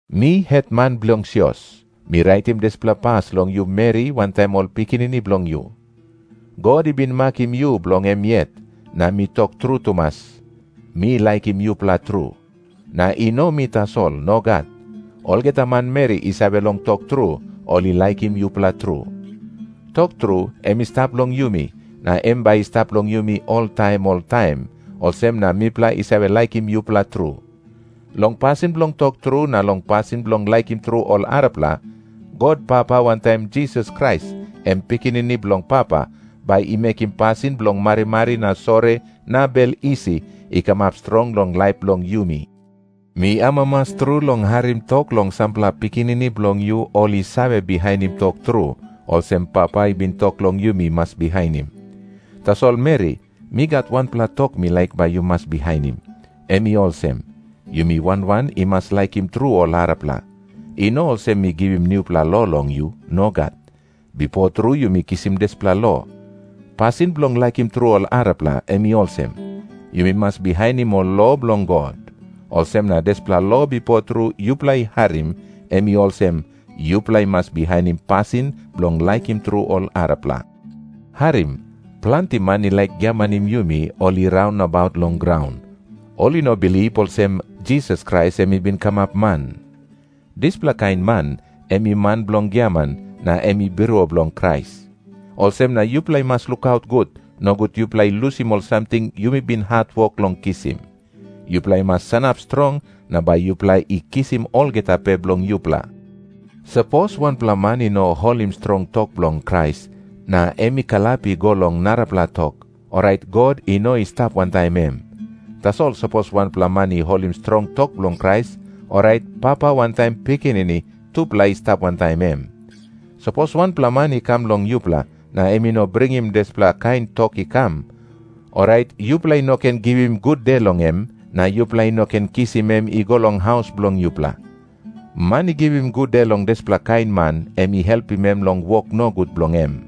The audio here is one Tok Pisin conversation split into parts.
Mi hetman bilong sios, mi raitim dispela pas long yu meri wantaim ol pikinini bilong yu. God i bin makim yu bilong em yet, na mi tok tru tumas, mi laikim yupela tru. Na i no mi tasol. Nogat. Olgeta manmeri i save long tok tru, ol i laikim yupela tru. Tok tru em i stap long yumi, na em bai i stap long yumi oltaim oltaim, olsem na mipela i save laikim yupela tru. Long pasin bilong tok tru na long pasin bilong laikim tru ol arapela, God Papa wantaim Jisas Krais, em Pikinini bilong Papa, bai i mekim pasin bilong marimari na sori na bel isi i kamap strong long laip bilong yumi. Mi amamas tru long harim tok long sampela pikinini bilong yu ol i save bihainim tok tru, olsem Papa i bin tok long yumi mas bihainim. Tasol meri, mi gat wanpela tok mi laik bai yu mas bihainim. Em i olsem, yumi wan wan i mas laikim tru ol arapela. I no olsem mi givim nupela lo long yu. Nogat. Bipo tru yumi kisim dispela lo. Pasin bilong laikim tru ol arapela, em i olsem. Yumi mas bihainim ol lo bilong God. Olsem na dispela lo bipo tru yupela i harim, em i olsem, yupela i mas bihainim pasin bilong laikim tru ol arapela. Harim. Planti man i laik giamanim yumi, ol i raun nabaut long graun. Ol i no bilip olsem, Jisas Krais em i bin kamap man. Dispela kain man, em i man bilong giaman, na em i birua bilong Krais. Olsem na yupela i mas lukaut gut, nogut yupela i lusim ol samting yumi bin hatwok long kisim. Yupela i mas sanap strong, na bai yupela i kisim olgeta pe bilong yupela. Sapos wanpela man i no holim strong tok bilong Krais, na em i kalap i go long narapela tok, orait God i no i stap wantaim em. Tasol sapos wanpela man i holim strong tok bilong Krais, orait Papa wantaim Pikinini tupela i stap wantaim em. Sapos wanpela man i kam long yupela, na em i no bringim dispela kain tok i kam, orait yupela i no ken givim gude long em, na yupela i no ken kisim em i go long haus bilong yupela. Man i givim gude long dispela kain man, em i helpim em long wok nogut bilong em.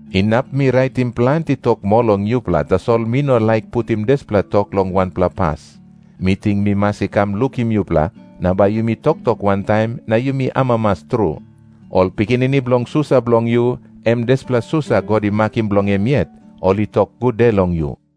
Inap mi raitim planti tok moa long yupela, tasol mi no laik putim dispela tok long wanpela pas. Mi ting mi mas i kam lukim yupela, na bai yumi toktok wantaim na yumi amamas tru. Ol pikinini bilong susa bilong yu, em dispela susa God i makim bilong em yet, ol i tok gude long yu.